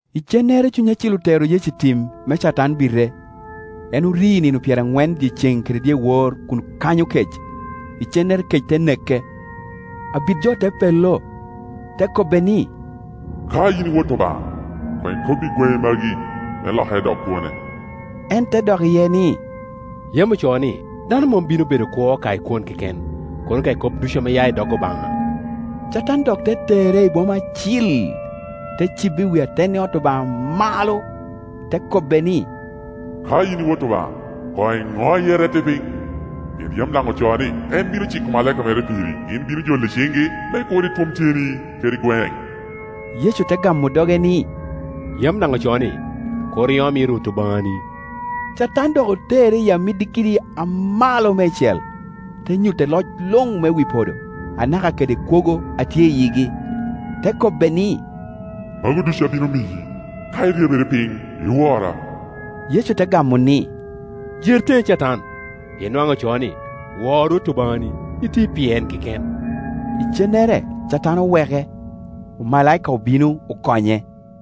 Icennere Cuny Acil otero Yecu i tim me Catan bite. En ofi nino pyeraŋwen dyeceŋ kede dyewor kun kanyo kec, icennere kec te neke. Abit jo te pello, te kobbe ni, “Ka in i Wot Obaŋa, koŋ ikobbi gweŋe magi me lokere dok kwone.” En te dok iye ni, “Yam ocoo ni, ‘Dano mom bino bedo kwo ka i kwon keken, kono ka i kop ducu ame ya i dok Obaŋa!’” Catan dok te tere i boma acil, te cibe i wi atenni ot Obaŋa malo, te kobbe ni, “Ka yin Wot Obaŋa, koŋ iŋoye, irette piny, pien yam daŋ ocoo ni, ‘En bino ciko omalaika mere piri’, ‘Gin bino joli i ciŋgi, me kur itwom tyeni kede gweŋ.’” Yecu te gamo doge ni, “Yam daŋ ocoo ni, ‘Kur iom yi Rwot Obaŋani.’” Catan dok otere i amiddi kidi amalo meicel, te nyutte loc luŋ me wi podo, anaka kede kwogo a tye i yigi, te kobbe ni, “Magu ducu abino miyi, ka iryebere piny, iwora.” Yecu te gamo ni, “Jer teŋe, Catan, pien nwaŋ ocoo ni, ‘Wor Rwot Obaŋani, iti pi en keken.’” Icennere Catan oweke, omalaika obino okonye.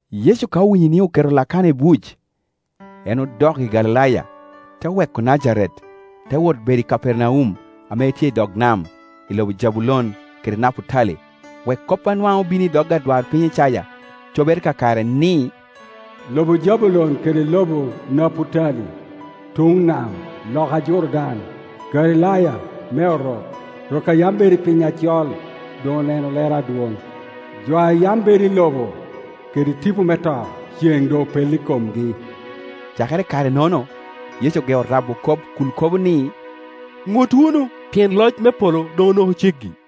Yecu ka owinyo ni oketo Lakana i buc, en odok i Galilaya, te weko Najaret, te wot bedo i Kapernaum, ame tye i dog nam, i lobo Jabulon kede Naputali, wek kop a nwaŋ obino i dog adwarpiny Icaya cobere kakare, ni, “Lobo Jabulon kede lobo Naputali, tuŋ nam, loka Jordan, Galilaya me Orok. Rok a yam bedo i piny acol doŋ oneno lero adwoŋ, jo a yam bedo i lobo kede tipo me to, cen doŋ opello i komgi.” Cakere i kare-nono Yecu ogeo rabo kop kun kobo ni, “Ŋut wunu, pien loc me polo doŋ onoko ceggi.”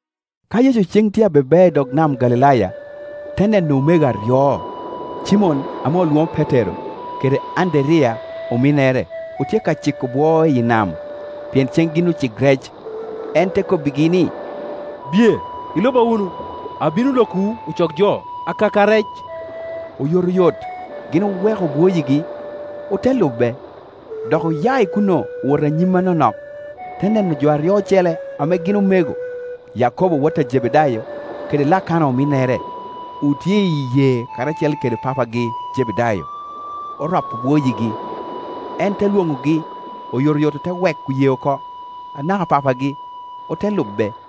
Ka Yecu ceŋ tye a be bea i dog nam Galilaya, te neno omego aryo, Cimon ame olwoŋo Petero, kede Anderiya ominnere; otye ka ciko bwo iyi nam, pien ceŋ gin ocik rec. En te kobbigi ni, “Biye, iluba wunu, abino lokowu ocok jo akaka rec.” Oyotoyot gin oweko bwoyigi, ote lube. Dok oya i kuno owoto anyim anonok, te neno jo aryo ocele ame gin omego, Yakobo wot a Jebedayo kede Lakana ominnere; otye i yee karacel kede papagi Jebedayo, oropo bwoyigi. En te lwoŋogi; oyotoyot ote weko yee oko, anaka papagi, ote lube.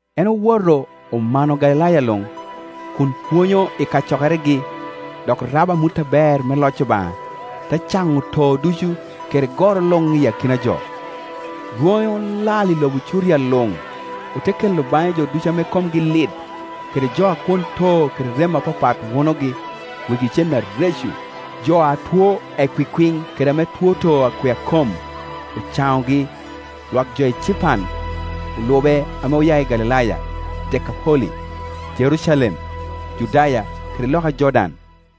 En owoto omano Galilaya luŋ, kun pwonyo i kacokeregi, dok rabo amut aber me loc Obaŋa, te caŋo too ducu kede goro luŋ i akina jo. Rwoŋe olal i lobo Curia luŋ, ote kelo baŋe jo ducu ame komgi lit, kede jo a kwon too kede rem apapat wunogi, wegi cen areco, jo a two ekwikwiŋ, kede ame two too akwea kom; ocaŋogi. Lwak jo ecipan olube ame oya i Galilaya, Dekapoli, Jerucalem, Judaya kede loka Jordan.